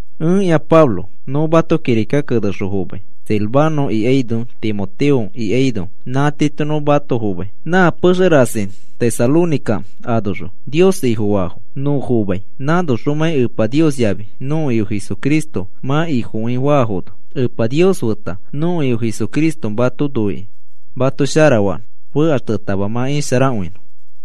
Ẽkĩa Pablo, nõ mato kirika kenexõ fomai, Silvano ikaino Timoteo ikaino nã tiito nõ mato fomai. Nã pexe rasi Tesalónica anoxõ Nios Ifofaafo nõ fomai, anoxomãi Epa Nios yafi nõko Ifo Jesucristo mã Ifokõi faafono. Epa Nios feta nõko Ifo Jesucristo mato noikĩ mato sharafanõ fekaxtetama mã isharakõinõ.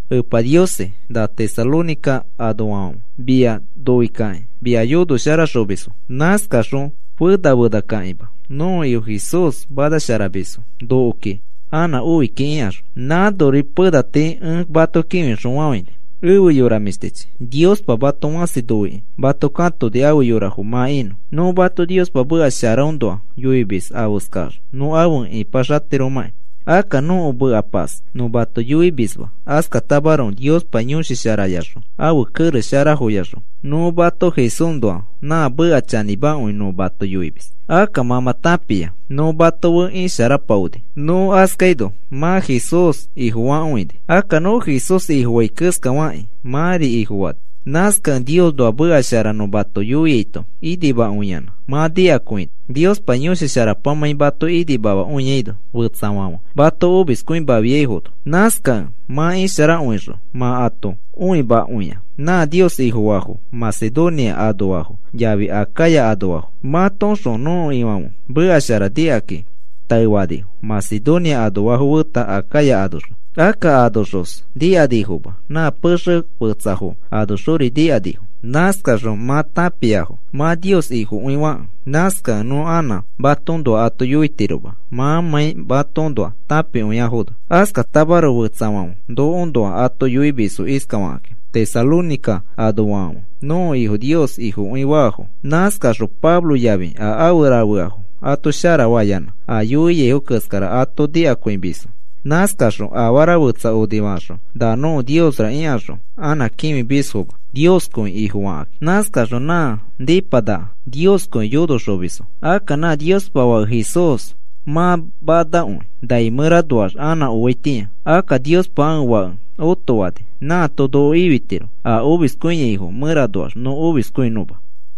“Epa Niosi, na Tesalónica anoafãfe, mia noikakĩ mia yonoxosharamisfo, nãskakaxõ fena fenakãkima nõko Ifo Jesús manasharamisfo nokoki anã oi kiki,” ikaxõ. Nãnori pena tii ẽ mato kĩfixõfafãini. Efe yora mĩshtichi, Niospa mato fãsi noikĩ mato katoni afe yorafo mã inõ. Nõ mato Niospa meka sharaõnoa yoimis afeskax nõ afe ĩpaxatiromãki. Akka nõko mekapas nõ mato yoimisma, askatamaroko Niospa Yõshi Sharayaxõ ãfe kerex sharafoyaxõ nõ mato Jesúsnoa nã meka chanĩmakõi nõ mato yoimis. Akka mã mã tãpia nõ mato fe isharapaoni. Nõ askaino mã Jesús Ifofakõini. Akka nõ Jesús Ifofai keskafakĩ mãri Ifofani. Nãskakẽ Niosnoa meka shara nõ mato yoiaito inimakõiyanã mã nikakõini, Niospa Yõshi Sharapamãi mato inimamakõiaino fetsafãfe mato omiskõimafiaifono. Nãskakẽ mã isharakõixõ mã ato õimakõia nã Nios Ifofaafo Macedonia anoafo yafi Acaya anoafo. Matoõxõ nõko Ifãfe meka shara nikakĩ taefanifo Macedonia anoafo feta Acaya anoxõ. Akka anoxos nikanifoma. Nã pexe fetsafo anoxori nikanifo. Nãskaxõ mã tãpiafo mã Nios Ifokõifakẽ. Nãskakẽ nõ anã matoõnoa ato yoitiroma, mãmãi matoõnoa tãpikõiafono. Askatamaroko fetsafãfe nokoõnoa ato yoimisfo iskafakãki: “Tesalónica anoafãfe nõko Ifo Nios Ifofakõinafo, nãskaxõ Pablo yafi a afe rafeafo ato sharafayanã a yoiaifo keskara ato nikakõimisfo. Nãskakaxõ afara fetsa onifakaxõ, ‘Na nõko niosra,’ ikaxõ anã kĩfimisfoma, Nioskõi Ifofakakĩ. Nãskakaxõ nã nipanaka Nioskõi yonoxomisfo. Akka nã Niospa Fake Jesús mã manakõi nai mẽranoax anã oaitĩa. Akka Niospa ãfe Fake otofani. Nãato noko ifitiro a omiskõiaifo mẽranoax nõ omiskõinõma.”